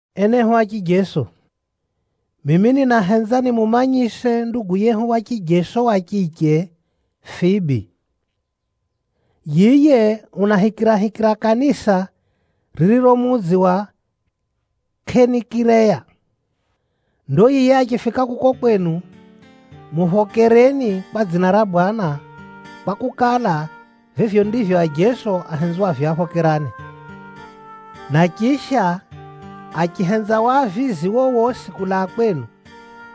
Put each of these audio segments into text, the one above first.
Enehu a chijeso, mimi ninahenza nimumanyise ndugu yehu wa chijeso wa chiche Fibi. Yiye unahikirahikira kanisa ririro mudzi wa Kʼenikireya. Ndo yiye achifika kuko kwenu, muphokereni kwa dzina ra Bwana, kwakukala, vivyo ndivyo ajeso ahenzwavyo aphokerane. Na chisha, achihenza wavizi wowosi kulaa kwenu,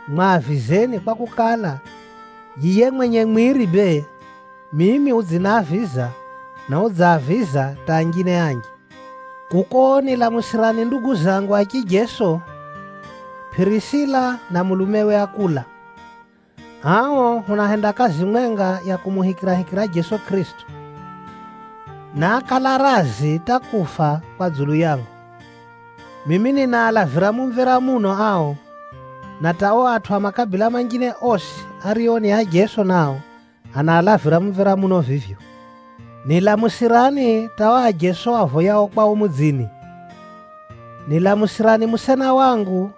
mwavizeni kwakukala, yiye mwenye mwiri bee, mimi udziniaviza, na udzaaviza hata anjine anji. Kuko nilamusirani ndugu zangu a chijeso, Pʼirisila na mulumewe Akula. Ao hunahenda kazi mwenga ya kumuhikirahikira Jeso Kʼirisito, na ákala razi hata kufa kwa dzulu yangu. Mimi ninaalavira mumvera muno ao, na hata o atʼu a makabila manjine osi ario ni ajeso nao, anaalavira mumvera muno vivyo. Nilamusirani hata o ajeso avoyao kwao mudzini. Nilamusirani musena wangu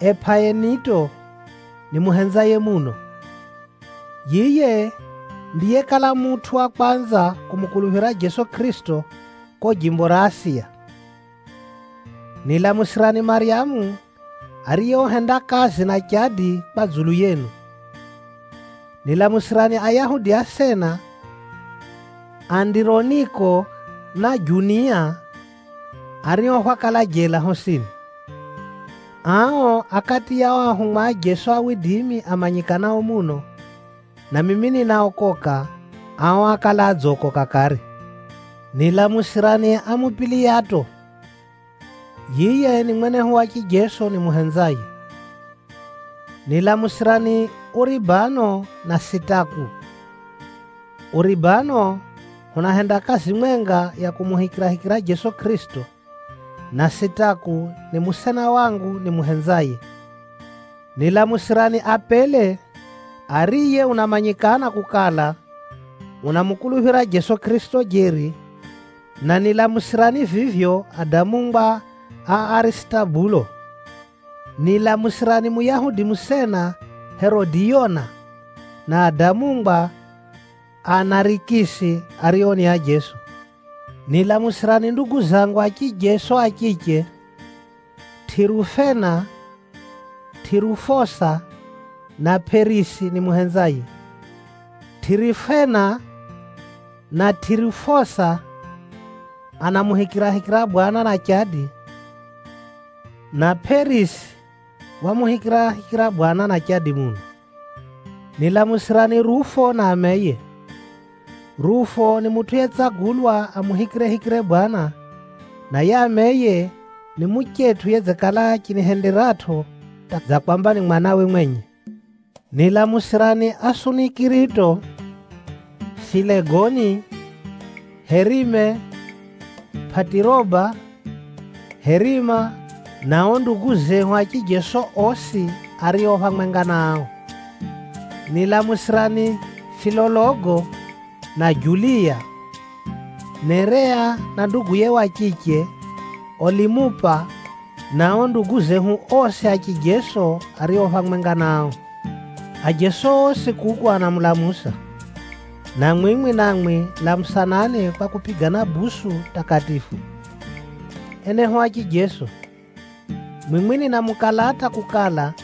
Epʼaineto nimuhenzaye muno. Yiye ndiyekala mutʼu wa kwanza kumukuluphira Jeso Kʼirisito ko jimbo ra Asiya. Nilamusirani Maryamu, ariye uhenda kazi na chadi kwa dzulu yenu. Nilamusirani Ayahudi asena, Andironiko na Junia, ario hwakala jela hosini. Ao a kati ya o ahumwa a Jeso amanyikanao muno, na mimi ninaokoka, ao ákala adzokoka kare. Nilamusirani Amupiliyato. Yiye ni mwenehu wa chijeso nimuhenzaye. Nilamusirani Uribano na Sitaku. Uribano hunahenda kazi mwenga ya kumuhikirahikira Jeso Kʼirisito, na Sitaku ni musena wangu nimuhenzaye. Nilamusirani Apele, ariye unamanyikana kukala, unamukuluphira Jeso Kʼirisito jeri, na nilamusirani vivyo adamungwa a Arisitobulo. Nilamusirani Muyahudi musena Herodiyona, na adamungwa a Narikisi ario ni ajeso. Nilamusirani ndugu zangu a chijeso a chiche, Tʼirufena, Tʼirufosa na Pʼerisi nimuhenzaye. Tʼirufena na Tʼirufosa anamuhikirahikira Bwana na chadi, na Pʼerisi wamuhikirahikira Bwana na chadi muno. Nilamusirani Rufo na ameye. Rufo ni mutʼu yetsagulwa amuhikirehikire Bwana, na yiye ameye ni muchetʼu yedzikala achinihenderatʼo hata dza kwamba ni mwanawe mwenye. Nilamusirani Asunikirito, Filegoni, Herime, Pʼatiroba, Herima, na o ndugu zehu a chijeso osi ario phamwenga na ao. Nilamusirani Filologo na Juliya, Nerea na nduguye wa chiche, Olimupa na o ndugu zehu osi a chijeso ario phamwenga na ao. Ajeso osi kuku anamulamusa, na mwimwi namwi lamusanani kwa kupigana busu takatifu. Enehu a chijeso, mwimwi ninamukalata kukala,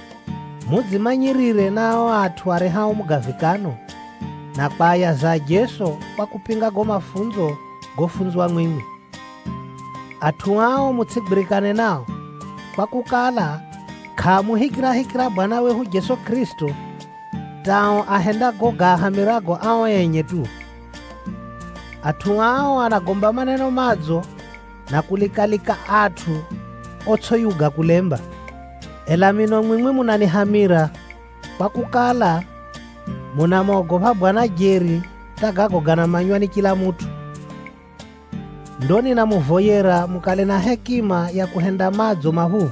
mudzimanyirire na ao atʼu arehao mugavikano, na kwayaza ajeso kwa kupinga gago mafunzo gofunzwa mwimwi. Atʼu ao mutsʼigwirikane nao, kwakukala, kʼaamuhikirahikira Bwana wehu Jeso Kʼirisito, hata o ahenda gago gaahamirago ao enye tu. Atʼu ao anagomba maneno madzo na kulika-lika atʼu otsʼiyuga kulemba. Ela mino mwimwi munanihamira, kwakukala, munamogopha Bwana jeri hata gago ganamanywa ni chila mutʼu. Ndo ninamuvoyera mukale na hekima ya kuhenda madzo maphuphu,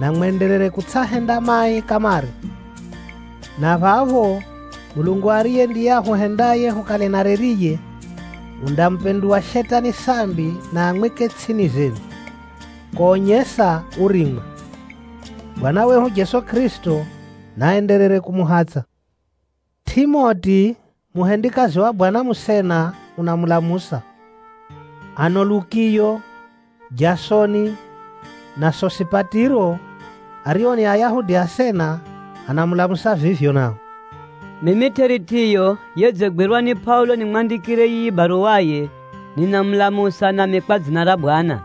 na mwenderere kutsʼahenda mai kamare. Na phapho Mulungu ariye ndiye ahuhendaye hukale na reriye, undamupinduwa Shetani sambi na amwike tsʼini zenu, konyesa urimwa. Bwana wehu Jeso Kʼirisito naenderere kumuhatsʼa. Tʼimoti, muhendikazi wa Bwana musena, unamulamusa. Ano Lukiyo, Jasoni na Sosipatiro, ario ni Ayahudi asena, anamulamusa vivyo nao. Mimi Tʼeritiyo yedzigwirwa ni Pʼaulo nimwandikire yiyi baruwaye, ninamulamusa nami kwa dzina ra Bwana.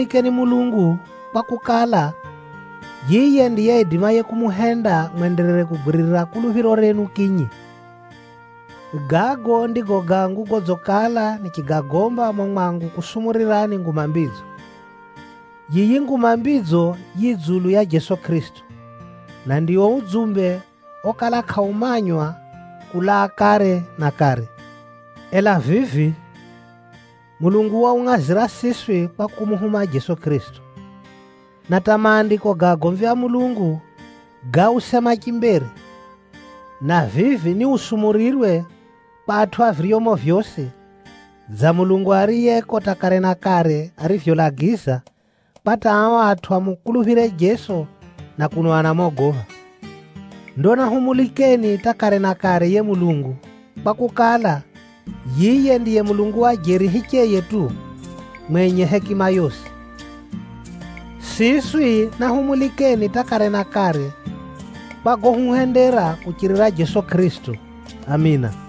Enehu a chijeso, siswi nahumulikeni Mulungu, kwakukala, yiye ndiye aidimaye kumuhenda mwenderere kugwiririra kuluphiro renu kinyi. Gago ndigo gangu godzikala nichigagomba mumo mwangu kusumurirani Nguma Mbidzo. Yiyi Nguma Mbidzo yi dzulu ya Jeso Kʼirisito, na ndio udzumbe okala kʼaumanywa kulaa kare na kare. Ela vivi, Mulungu waungʼazira siswi kwa kumuhuma Jeso Kʼirisito. Na hata Maandiko ga agomvi a Mulungu gáusema chimbere, na vivi niusumurirwe kwa atʼu a viryomo vyosi, dza Mulungu ariyeko hata kare na kare arivyolagiza, kwa hata ao atʼu amukuluphire Jeso na kuno anamogopha. Ndo nahumulikeni hata kare na kare yiye Mulungu, kwakukala, yiye ndiye Mulungu wa jeri hicheye tu, mwenye hekima yosi. Siswi nahumulikeni hata kare na kare, kwa gohuhendera kuchirira Jeso Kʼirisito! Amina.